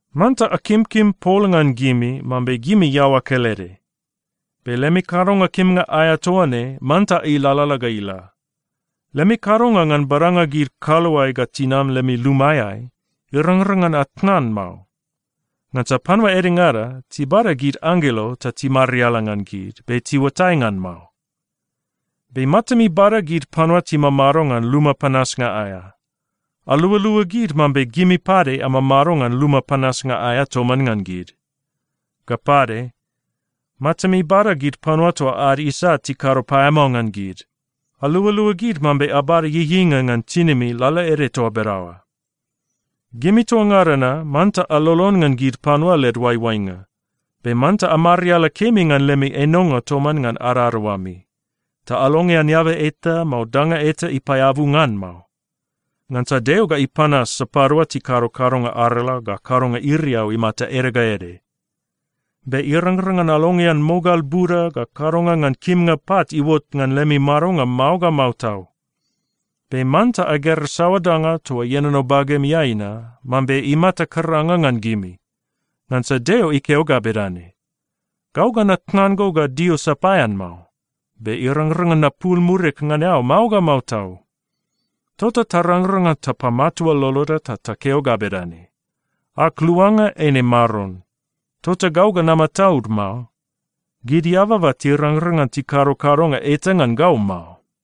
Manta akimkim pol ngan gimi mambe gimi iaoa kelede. Be lemi kadonga kimnga aea toa ne manta ilalala ga ila. Lemi kadonga ngan badanga gid kaluae ga tinam lemi lumaeai, irangrang ngan atnan mao. Ngansa panua edengada tibada gid anggelo ta timariala ngan gid, be tiuatai ngan mao. Be matami bada gid panua timamado ngan luma panasnga aea. Alualua gid mambe gimi pade amamado ngan luma panasnga aea toman ngan gid. Ga pade, matami bada gid panua toa ad isat tikado paeamao ngan gid. Alualua gid mambe abada ieieinga ngan tinimi lalaede toa bedaoa. Gimi toa ngada na manta alolon ngan gid panua led oaioainga. Be manta amariala kemi ngan lemi enonga toman ngan adadaoami. Ta alongean eaba eta, mao danga eta pade ipaeabu ngan mao. Ngansa Deo ga ipanas sapadua tikado kadonga arala ga kadonga iriau imata ede ga ede. Be irangrang ngan alongean mogal buda ga kadonga ngan kimnga pat iuot ngan lemi madonga mao ga mao tau. Be manta agera saoa danga toa ienono bagemiai na mambe imata karanga ngan gimi. Ngansa Deo ikeo ga bedane, “Gau ga natnan go ga dio sapaean mao. Be irangrang ngan napul murig ngan eao mao ga mao tau.” Tota tarangrang ngan tapamatua loloda ta takeo ga bedane, “Ag Luanga eine Maron. Tota gau ga namataud mao. Gid eababa tirangrang ngan tikado kadonga eta ngan gau mao.”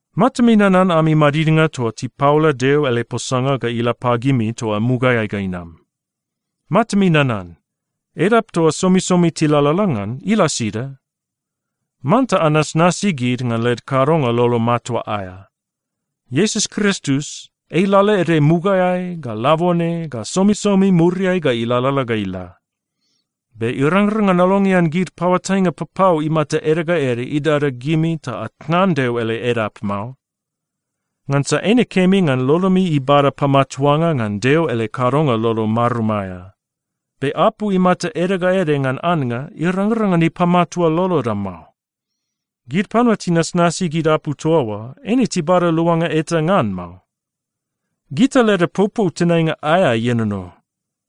Matami nanan ami madidnga toa tipaola Deo ele posanga ga ila pagimi toa mugaeai ga inam. Matami nanan, edap toa somisomi tilalala ngan, ila sida? Manta anasnasi gid ngan led kadonga lolo matua aea. Iesus Kristus, ei lalaede mugaeai, ga labone, ga somisomi muriai ga ilalala ga ila. Be irangrang ngan alongean gid paoatainga papau imata ede ga ede idada gimi ta atnan Deo ele edap mao. Ngansa eine kemi ngan lolomi ibada pamatuanga ngan Deo ele kadonga lolo marum aea. Be apu imata ede ga ede ngan annga, irangrang ngan ipamatua loloda mao. Gid panua tinasnasi gid apu toa oa, eine tibada luanga eta ngan mao. Gita leda popou tenainga aea ienono.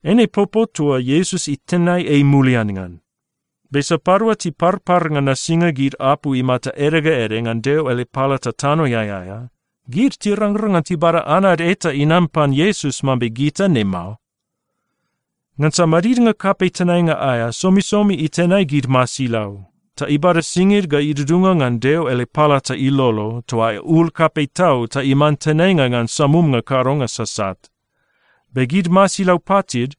Eine popou toa Iesus itenai ei mulian ngan. Be sapadua tiparpar ngan nasinga gid apu imata ede ga ede ngan Deo ele palata tanoeai aea, gid tirangrang ngan tibada anad eta inam pan Iesus mambe gita ne mao. Ngansa madidnga kapei tenainga aea somisomi itenai gid masilau, ta ibada singid ga idudunga ngan Deo ele palata ilolo toa aea ul kapei tau ta iman tenainga ngan samumnga kadonga sasat. Be gid masilau patid,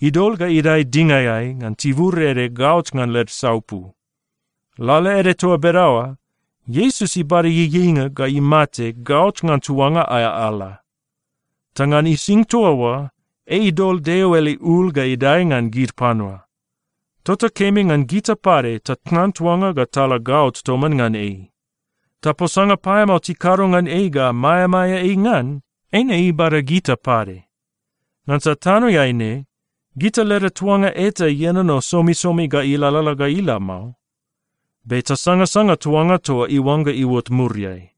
idol ga idae dingaeai ngan tibur ede gaot ngan led saupu. Lalaede toa bedaoa, Iesus ibada ieieinga ga imate gaot ngan tuanga aea ala. Ta ngan ising toa oa, ei idol Deo ele ul ga idae ngan gid panua. Tota kemi ngan gita pade tatnan tuanga ga tala gaot toman ngan ei. Ta posanga paeamao tikado ngan ei ga maeamaea ei ngan, eine ibada gita pade. Ngansa tanoeai ne, gita leda tuanga eta ienono somisomi ga ilalala ga ila mao. Be tasangasanga tuanga toa iuangga iuot muriai.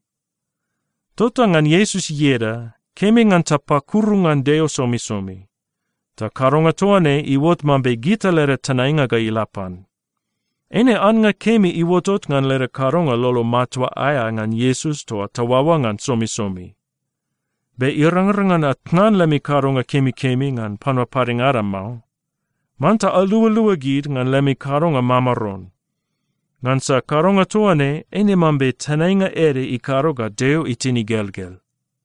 Tota ngan Iesus ieda, kemi ngan tapakuru ngan Deo somisomi. Ta kadonga toa ne iuot mambe gita leda tenainga ga ila pan. Eine annga kemi iuotot ngan leda kadonga lolo matua aea ngan Iesus toa taoaoa ngan somisomi. Be irangrang ngan atnan lemi kadonga kemikemi ngan panua padengada mao. Manta alualua gid ngan lemi kadonga mamaron. Ngansa kadonga toa ne eine mambe tenainga ede ikado ga Deo itin igelgel.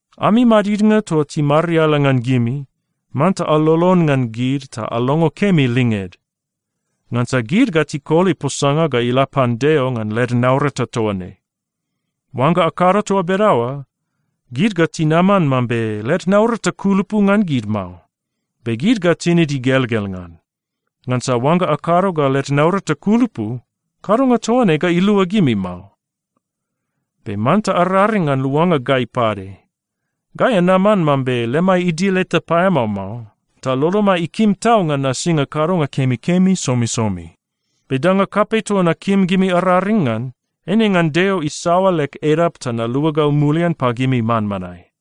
Ami madidnga toa timariala ngan gimi, manta alolon ngan gid ta alongo kemi linged. Ngansa gid ga tikoli posanga ga ila pan Deo ngan led naurata toa ne. Oangga akado toa bedaoa, gid ga tinaman mambe led naurata kulupu ngan gid mao, be gid ga tinid igelgel ngan. Ngansa oangga akado ga led naurata kulupu, kadonga toa ne ga ilua gimi mao. Be manta araring ngan luanga gai pade. Gai anaman mambe lemai idil eta paeamao mao, ta lolomai ikim tau ngan nasinga kadonga kemikemi somisomi. Be danga kapei toa nakim gimi araring ngan, eine ngan Deo isaoa leg edap ta naluagau mulian pagimi manmanae.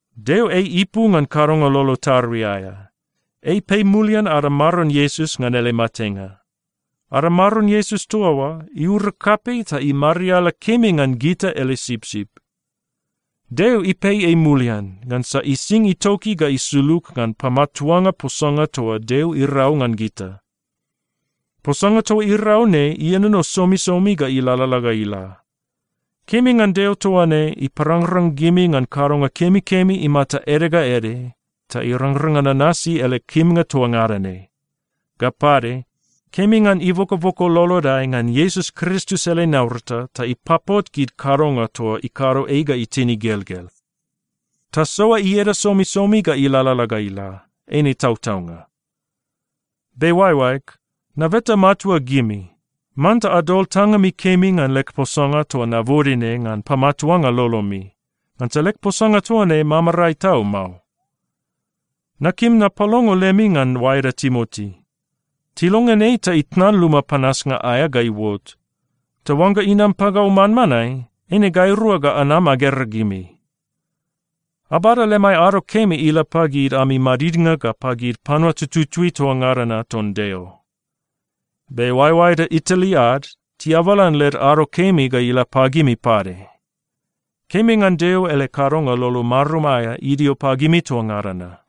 Deo ei ipu ngan kadonga lolo tarui aea. Ei ipei mulian ada Maron Iesus ngan ele matenga. Ada Maron Iesus toa oa iura kapei ta imariala kemi ngan gita ele sipsip. Deo ipei ei mulian, ngansa ising itoki ga isulug ngan pamatuanga posanga toa Deo irau ngan gita. Posanga toa irau ne ienono somisomi ga ilalala ga ila. Kemi ngan Deo toa ne iparangrang gimi ngan kadonga kemikemi imata ede ga ede ta irangrang ngan anasi ele kimnga toa ngada ne. Ga pade, kemi ngan ibokoboko lolodai ngan Iesus Kristus ele naurata ta ipapot gid kadonga toa ikado ei ga itin igelgel. Tasoa ieda somisomi ga ilalala ga ila. Eine tautaunga. Be oaeoaeg, nabeta matua gimi, manta adol tangami kemi ngan leg posanga toa nabode ne ngan pamatuanga lolomi. Ngansa leg posanga toa ne mamarae tau mao. Nakim napalongo lemi ngan oaeda Timoti, tilongean ei ta itnan luma panasnga aea ga iuot. Ta oangga inam pagau manmanae, eine gairua ga anam agera gimi. Abada lemai ado kemi ila pagid ami madidnga ga pagid panua tututui toa ngada na ton Deo. Be oaeoaeda Itali ad, tiabalan led ado kemi ga ila pagimi pade. Kemi ngan Deo ele kadonga lolo marum aea idio pagimi toa ngada na.